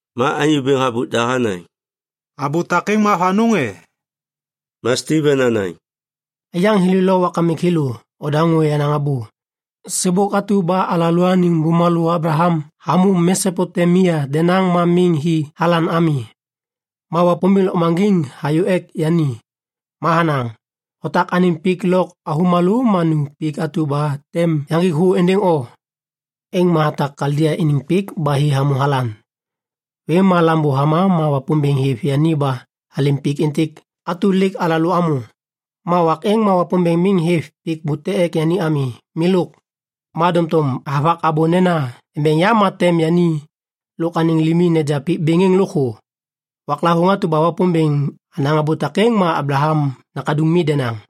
Ma anyô bêŋ habôk da hanaŋ, “Abô takêŋ ma avanôŋ e?” Ma Stiven hanaŋ, “Aiyaŋ thêlô lo wakamik thêlô, nodaŋô yenaŋ abô! Sêbôk atu ba alalôaniŋ bumalô Ablaham hamô Mesopotemia denaŋ ma miŋ hi Halan ami, ma Wapômbêŋ lôkmaŋgiŋ hayô ek yani. Ma hanaŋ, ‘Otak anêm pik lôk avômalô ma nu pik atu ba tem yaŋgik thô êndêŋ o.’ “Êŋ ma hatak Kaldia iniŋ pik ba hi hamô Halan. Vêm ba lambô hama ma Wapômbêŋ hêv yani ba halêm pik êntêk atu lêk alalô amô. Ma wak êŋ ma Wapômbêŋ miŋ hêv pik bute ek yani ami, milôk. Ma doŋtom havak abô nena embeŋ yam ma tem yani lôk anêŋ limi neja pik bêŋ êŋ lôkthô. Waklavôŋ atu ba Wapômbêŋ hanaŋ abô takêŋ ma Ablaham nakaduŋ mi denaŋ.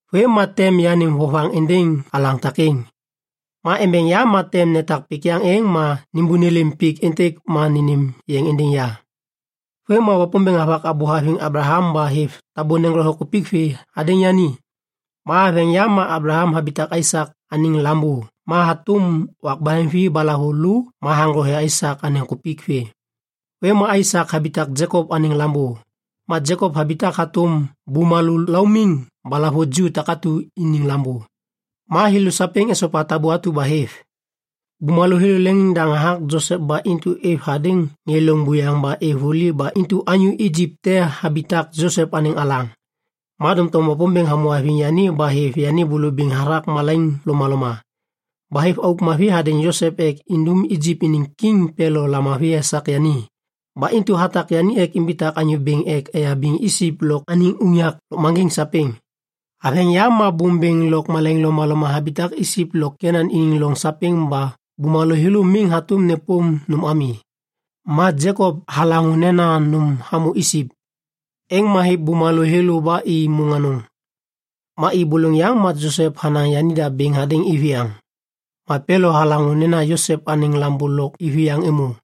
Vêm ma tem yanêm vovaŋ êndêŋ alaŋ takêŋ. Ma embeŋ yam ma tem netak pik yaŋ êŋ ma nêbônêlêm pik êntêk ma nênêm yeŋ êndêŋ ya.’ Vêm ma Wapômbêŋ havak abô haviŋ Ablaham ba hêv tabô neŋgothe kupik vê hadêŋ yani. Ma haveŋ yam ma Ablaham habitak Aisak anêŋ lambô ma hatôm wak baheŋvi ba lahavulô ma haŋgothe Aisak anêŋ kupik vê. Vêm ma Aisak habitak Jekop anêŋ lambô, ma Jekop habitak hatôm bumalô laumiŋ ba lahavuju takatu iniŋ lambô. Ma thêlô sapêŋ esopa tabô atu ba hêv. “Bumalô thêlô leŋiŋdaŋ hathak Josep ba intu êv hadêŋ ŋê loŋ buyaŋ ba êv vuli ba intu anyô Ijip te habitak Josep anêŋ alaŋ. Ma doŋtom Wapômbêŋ hamô haviŋ yani ba hêv yani bulubiŋ hathak malaiŋ lomaloma. Ba hêv auk mavi hadêŋ Josep ek indum Ijip iniŋ kiŋ Pelo lamavi esak yani. Ba intu hatak yani ek imbitak anyô bêŋ ek eyabiŋ Ijip lôk anêŋ unyak lôkmaŋgiŋ sapêŋ. “Haveŋ yam ma bôm bêŋ lôk malaiŋ lomaloma habitak Ijip lo Kenan iniŋ loŋ sapêŋ ba bumalô thêlô miŋ hatôm nêpôm nôm ami. Ma Jekop halaŋô nena nôm hamô Ijip. Êŋ ma hêv bumalô thêlô ba i môŋ anôŋ. Ma i bôlôŋ yaŋ, ma Josep hanaŋ yanida bêŋ hadêŋ iviyaŋ. Ma Pelo halaŋô nena Josep anêŋ lambô lôk iviyaŋ êmô.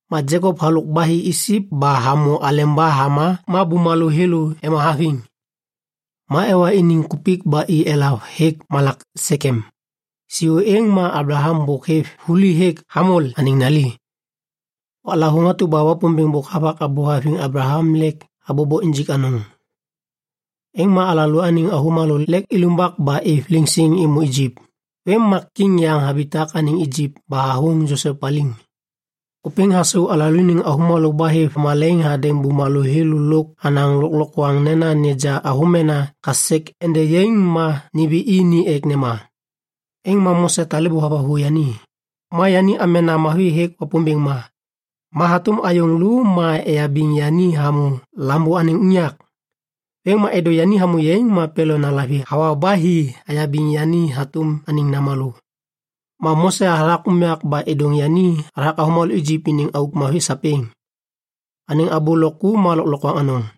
Ma Jekop halôk ba hi Ijip ba hamô aleba hama ma bumalô thêlô ema haviŋ. Ma ewa iniŋ kupik ba i elav hêk malak Sekem. Siô êŋ ma Ablaham bôk hêv vuli hêk Hamol anêŋ nali. “Waklavôŋ atu ba Wapômbêŋ bôk havak abô haviŋ Ablaham lêk habobo injik anôŋ, êŋ ma alalôaniŋ avômalô lêk ilumbak ba êv liŋsiŋ êmô Ijip. Vêm ma kiŋ yaŋ habitak anêŋ Ijip ba hathôŋ Josep paliŋ. Ôpêŋ hasau alalôaniŋ avômalô ba hêv malaiŋ hadêŋ bumalô thêlô lôk hanaŋ lôklokwaŋ nena neja avômena kasek ende yaiŋ ma nimbi i ni ek nema. “Êŋ ma Mose talêbô havathu yani, ma yani amena mavi hêk Wapômbêŋ ma. Ma hatôm ayôŋ lô ma eyabiŋ yani hamô lambô anêŋ unyak. Vêm ma êdô yani hamô yaiŋ ma Pelo nalavi hawa ba hi hayabiŋ yani hatôm anêŋ namalô. Ma Mose hathak unyak ba êdôŋ yani hathak avômalô Ijip iniŋ auk mavi sapêŋ. Anêŋ abô lôk ku ma lôklokwaŋ anôŋ.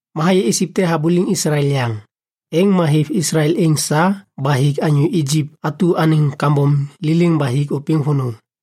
Ma hayê Ijip te habuliŋ Islael yaŋ. Êŋ ma hêv Islael êŋ sa ba hik anyô Ijip atu anêŋ kambom liliŋ ba hik ôpêŋ vônô.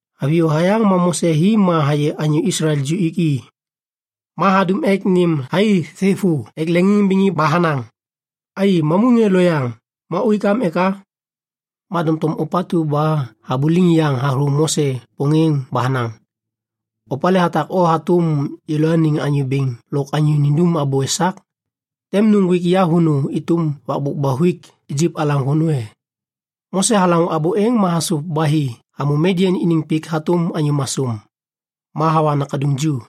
Haviyô hayaŋ ma Mose hi ma hayê anyô Islael ju ik i. Ma hadum ek nêm thai thêvô ek leŋiŋimbiŋ i ba hanaŋ, ‘Ai, mamu ŋê loyaŋ. Ma uik am eka?’ “Ma doŋtom ôpatu ba habuliŋ yaŋ hathô Mose pôŋêŋ ba hanaŋ, ‘Opalê hatak o hatôm yêlôaniŋ anyô bêŋ lôk anyô nindum abô esak? Tem nuŋgwik ya vônô êtôm wakbôk ba huik Ijip alaŋ vônô e?’ Mose halaŋô abô êŋ ma hasôv ba hi hamô Midian iniŋ pik hatôm anyô masôm. Ma hawa nakaduŋ ju.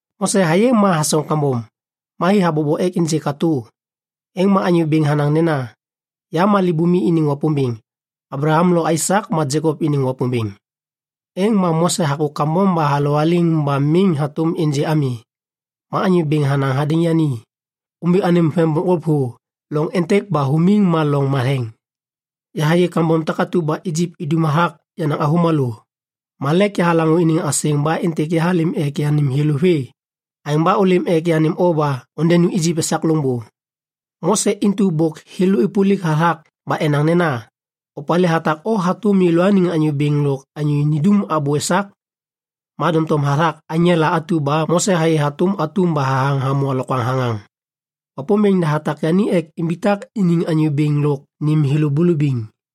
Mose hayê ma hasoŋ kambom. Ma hi habobo ek ênjê katô, êŋ ma Anyô Bêŋ hanaŋ nena, ‘Ya libumi iniŋ Wapômbêŋ, Ablaham lo Aisak ma Jekop iniŋ Wapômbêŋ.’ Êŋ ma Mose hakô kambom ba halowaliŋ ba miŋ hatôm ênjê ami. “Ma Anyô Bêŋ hanaŋ hadêŋ yani, ‘Ômbi anêm vem bokŋgôp thô. Loŋ êntêk ba humiŋ ma loŋ matheŋ. Yahayê kambom takatu ba Ijip idum hathak yenaŋ avômalô. Ma lêk yahalaŋô iniŋ asêŋ ba êntêk yahalêm ek yanêm thêlô vê. Aêŋ ba ôlêm ek yanêm o ba ondenu Ijip esak loŋbô.’ “Mose intu bôk thêlô êpôlik hathak ba enaŋ nena, ‘Opalê hatak o hatôm yêlôaniŋ anyô bêŋ lôk anyô nindum abô esak?’ Ma doŋtom hathak aŋela atu ba Mose hayê hatôm atum ba hathaŋ hamô alokwaŋ thaŋaŋ, Wapômbêŋ da hatak yani ek imbitak iniŋ anyô bêŋ lôk nêm thêlô bulubiŋ.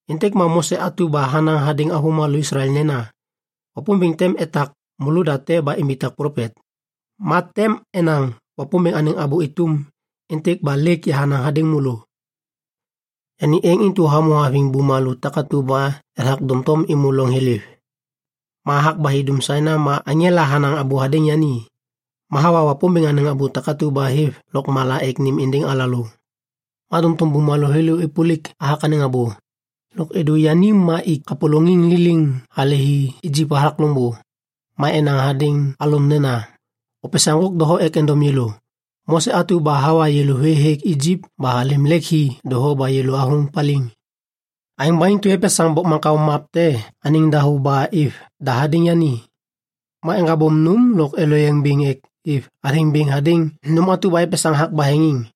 “Êntêk ma Mose atu ba hanaŋ hadêŋ avômalô Islael nena, ‘Wapômbêŋ tem etak môlôda te ba imbitak plopet. Ma tem enaŋ Wapômbêŋ anêŋ abô êtôm êntêk ba lêk yahanaŋ hadêŋ môlô.’ Yani êŋ intu hamô haviŋ bumalô takatu ba ethak doŋtom êmô loŋ thiliv. Ma hathak ba hi dum Sainai ma aŋela hanaŋ abô hadêŋ yani. Ma hawa Wapômbêŋ anêŋ abô takatu ba hêv lôkmala ek nêm êndêŋ alalô. “Ma doŋtom bumalô thêlô êpôlik hathak anêŋ abô. Lôk êdô yani ma ik kapôlôŋiŋ liliŋ hale hi Ijip hathak loŋbô. Ma enaŋ hadêŋ Alon nena, ‘Opesaŋ ŋgôk doho ek endom yêlô. Mose atu ba hawa yêlô vê hêk Ijip ba alêm lêk hi doho ba yêlô athôŋ paliŋ.’ Aêŋ ba intu epesaŋ bokmaŋkao map te anêŋ dahô ba êv da hadêŋ yani. Ma eŋgabôm nôm lôk eloyeŋ bêŋ ek êv athêŋ bêŋ hadêŋ nôm atu ba epesaŋ hathak baheŋiŋ.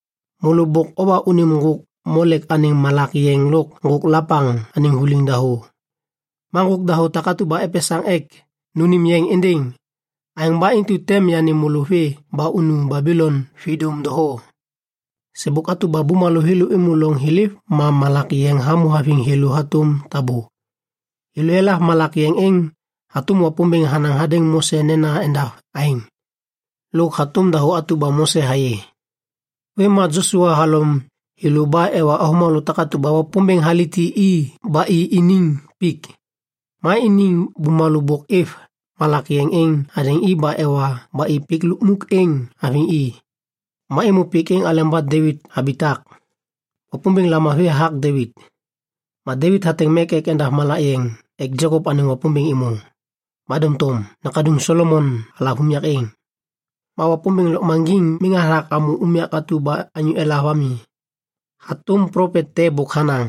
Môlô bôk owa unim ŋgôk Molek anêŋ malak yeŋ lôk ŋgôk Lepaŋ anêŋ vuliŋ dahô, ma ŋgôk dahô takatu ba opesaŋ ek nônêm yeŋ êndêŋ. Aêŋ ba intu tem yanêm môlô vê ba unu Babilon vidôm doho.’ “Sêbôk atu ba bumalô thêlô êmô loŋ thiliv ma malak yeŋ hamô haviŋ thêlô hatôm tabô. Thêlô elav malak yeŋ êŋ hatôm Wapômbêŋ hanaŋ hadêŋ Mose nena endav aêŋ, lôk hatôm dahô atu ba Mose hayê. Vêm ma Josua halom thêlô ba ewa avômalô takatu ba Wapômbêŋ haliti i ba i iniŋ pik. Ma iniŋ bumalô bôk êv malak yeŋ êŋ hadêŋ i ba ewa ba i pik lukmuk êŋ haviŋ i. Ma êmô pik êŋ aleba Devit habitak. Wapômbêŋ lamavi hathak Devit. Ma Devit hateŋ mek ek endav malak yeŋ ek Jekop anêŋ Wapômbêŋ êmô. Ma doŋtom nakaduŋ Solomon halav unyak êŋ. “Ma Wapômbêŋ Lôkmaŋgiŋ miŋ hathak hamô unyak atu ba anyô elav ami. Hatôm plopet te bôk hanaŋ: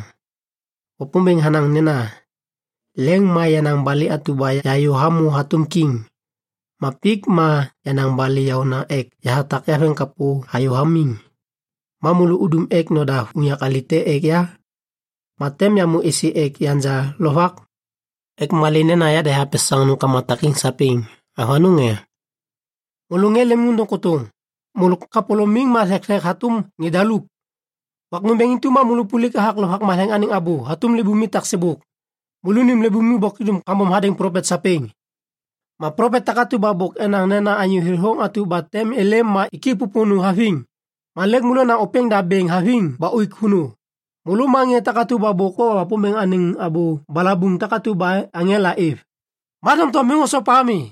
“Wapômbêŋ hanaŋ nena, ‘Leŋ ma yenaŋ balê atu ba yahayô hamô hatôm kiŋ, ma pik ma yenaŋ balê yaôna ek yahatak yaveŋkapô hayô hamiŋ. Ma môlô udum ek nodav unyak alê te ek ya? Ma tem yamô êsê ek yanja lovak? Ek malê nena yada yahapesaŋ nômkama takêŋ sapêŋ. Avanôŋ e?’ “Môlô ŋê lemimôndôŋ kôtôŋ. Môlô kapôlômim ma thekthek hatôm ŋê daluk. Wak nômbêŋ intu ma môlô ôpôlik hathak Lovak Matheŋ anêŋ abô hatôm libumi taksêbôk. Môlônim libumi bôk idum kambom hadêŋ plopet sapêŋ! Ma plopet takatu ba bôk enaŋ nena Anyô Thêthôŋ atu tem êlêm ma ik i pôpônô haviŋ. Ma lêk môlô onaŋ ôpêŋda bêŋ haviŋ ba uik vônô. Môlô ma ŋê takatu ba bôk owa Wapômbêŋ anêŋ abô balabuŋ takatu ba aŋela êv, ma doŋtom miŋ osopa ami.”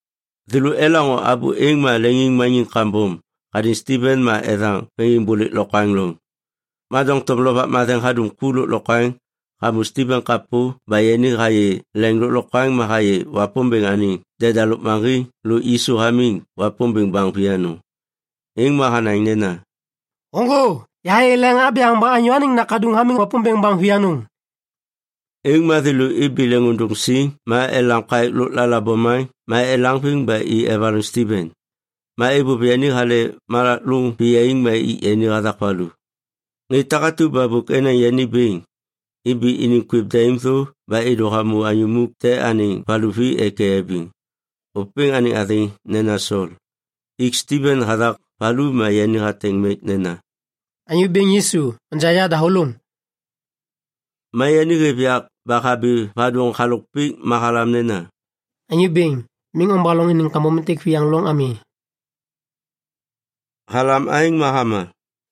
Thêlô elaŋô abô êŋ ma leŋiŋmaniŋ kambom hadêŋ Stiven ma ethaŋ veŋiŋbôlêk lokwaŋ loŋ. Ma doŋtom Lovak Matheŋ hadum ku lôklokwaŋ hamô Stiven kapô ba yani hayê leŋ lôklokwaŋ ma hayê Wapômbêŋ anêŋ deda lôkmaŋgiŋ lôk Yisu hamiŋ Wapômbêŋ baŋ vianôŋ. Êŋ ma hanaŋ nena, “Ôŋgô! Yahayê leŋ abyaŋ ba Anyô Anêŋ Nakaduŋ atu hamiŋ Wapômbêŋ baŋ vianôŋ.” Êŋ ma thêlô ibi leŋiŋôndôŋ siŋ ma elam kaêk lôklala bomaŋ ma elaŋviŋ ba i evaloŋ Stiven. Ma êvôv yani hale malak lôŋ viyaiŋ ma ik yani hathak valu. Ŋê takatu ba bôk enaŋ yani bêŋ, ibi iniŋ kwêv daim thô ba êdô hamô anyô muk te anêŋ valuvi ek eyabiŋ. Ôpêŋ anêŋ athêŋ nena Sol. Ik Stiven hathak valu ma yani hateŋ mek nena, “Anyô Bêŋ Yisu, onja yadahôlôŋ.” Ma yani hêv yak ba habi vadôŋ halôk pik ma halam nena, “Anyô Bêŋ, miŋ ombaloŋ iniŋ kambom êntêk viyaŋ loŋ ami.” Halam aêŋ ma hama.